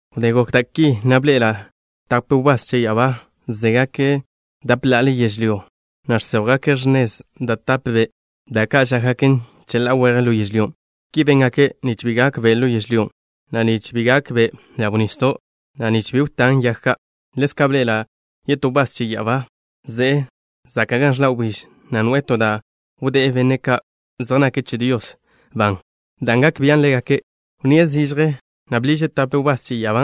Wdé gokgak da' ki, na' bḻe'ela' tape wbás che ya'abá zégake' dape ḻa'ale yežlyó, na' žséjwgake' x̱nezgak da' tape be', da' ka' žákgaken cheḻá'a weje ḻo yežlyó. Ki béngake' nich bi gak be' ḻo yežlyó, na' nich bi gak be' ḻaw nisdo', na' nich bi wtán yag ka'. Ḻezka' bḻe'ela' yetó wbás che ya'abá ze'e zaka' gan ẕḻa' wbíž, na' noe'e to da' wdé'e benne' ka' zej nake' che Dios ban, dan' gak bian' ḻégake'. Wnníe' zižje, na' bḻiže' tape wbás che ya'abá,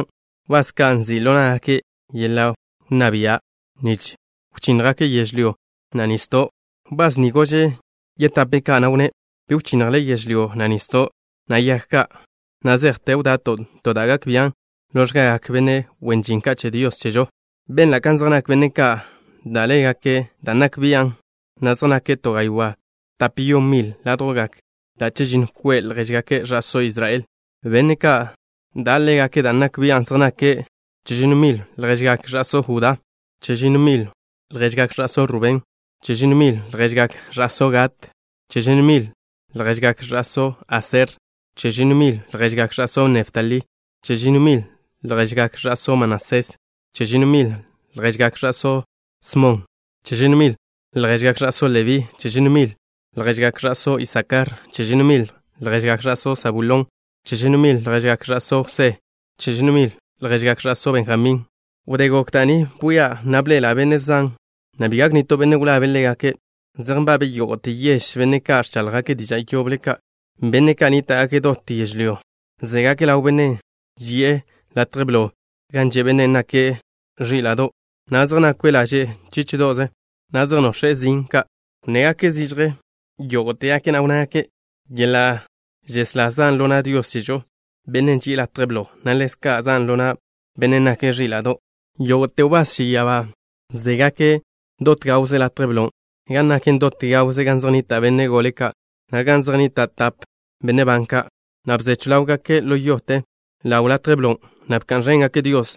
wbás ka' nzi' ḻo ná'gake' yeḻa' wnná bia' nich wchínnjgake' yežlyó, na' nisdo'. Wbás ni gože' yetape' ka', na' wnné': “Bi wchinnjle yežlyó, na' nisdo', na' yag ka' na' zejte wda'to' to da' gak bian' ḻo x̱gagak benne' wen žin ka' che Dios chežo.” Benla' kan zej nak benne' ka' da' ḻégake' dan' nak bian', na' zej nake' to gaywá' tape yon mile' ládjwgak da' chežinno kwe' lježgak ẕa'só Israel. Benne' ka' da' ḻégake' dan' nak bian' zej nake': Chežinno mil lježgak ẕa'só Judá. Chežinno mil lježgak ẕa'só Rubén. Chežinno mil lježgak ẕa'só Gad. Chežinno mil lježgak ẕa'só Aser. Chežinno mil lježgak ẕa'só Neftalí. Chežinno mil lježgak ẕa'só Manasés. Chežinno mil lježgak ẕa'só Smon. Chežinno mil lježgak ẕa'só Lebí. Chežinno mil lježgak ẕa'só Isakar. Chežinno mil lježgak ẕa'só Sabulón. Chežinno mil lježgak ẕa'só Jwsé. Chežinno mil lježgak ẕa'só Benjamín. Wdé gok da' ni bwia', na' bḻe'ela' benne' zan, na' bi gak nitó benne' wlabe' ḻégake'. Zej nbabe' yógo'te yež benne' ka' ẕcháḻjgake' diža' yoble ka', benne' ka' nníta'gake' dot yežlyó. Zégake' ḻaw Bennen' ži'e latje blon' gan že' Bennen' nake' Ẕíla'do', na' zej nakwe' laže' ẕíla'do'ze, na' zej nox̱e' zin ka'. Wnnégake' zižje yógo'tegake', na' wnnágake': ¡Yeḻa' žeslá zan' ḻo na' Dios chežo, Bennen' ži'e latje blo, na' ḻezka' zan' ḻo na' Bennen' nake' Ẕíla'do'! Yógo'te wbás che ya'abá zégake' dot gawze latje blon', gan naken dot gawze gan zej nnita' benne' gole ka', na' gan zej nnita' tape benne' ban ka', na' bzechw ḻáwgake' ḻo yote ḻaw latje blon', na' bka'n ẕéngake' Dios,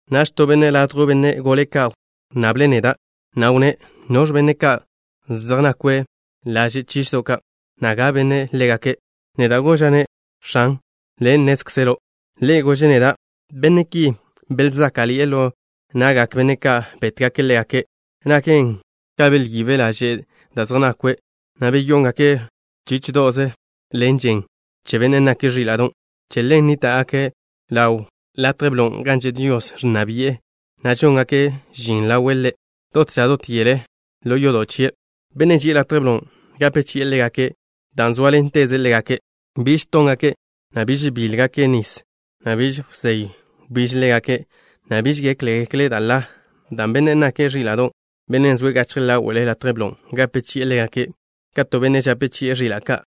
Naž to benne' ladjw benne' gole ka' wnnable' neda', na' wnné': “¿Noẕ benne' ka' zej nakwe' laže' ẕíla'do'ze, na' ga benne' ḻégake'?” Neda' goža'-ne': “X̱an, le' nnézkzelo'.” Ḻe' gože' neda': “Benne' ki belzáka'ḻi'e ḻo na'gak benne' ka' bétgake' ḻégake'. Naken ka belyibe' laže' da' zej nakwe', na' beyóngaken' ẕíla'do'ze ḻen žen che Bennen' nake' Ẕíla'do'. Che ḻen nníta'gake' ḻaw latje blon' gan že' Dios, ẕnna bi'e, na' žóngake' žin ḻawe' Ḻe' dot ža dot yele ḻo yodo' chie'. Bennen' ži'e latje blon' gape chi'e ḻégake' dan' zóaḻenteze' ḻégake'. Biž tóngake', na' biž bíḻegake' nis, na' biž wzéy wbíž ḻégake', na' biž gékgekle' da' ḻa, dan' Bennen' nake' Ẕíla'do', Benne' zoe' gachje ḻáwe'le latje blon', gape chi'e ḻégake' ka to benne' žape chi'e ẕila' ka'.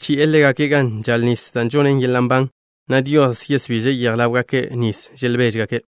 Chi'e ḻégake' gan žal nis da' žonnen yeḻa' nban, na' Dios yesbiže' yej ḻáwgake' nis želbeže'.”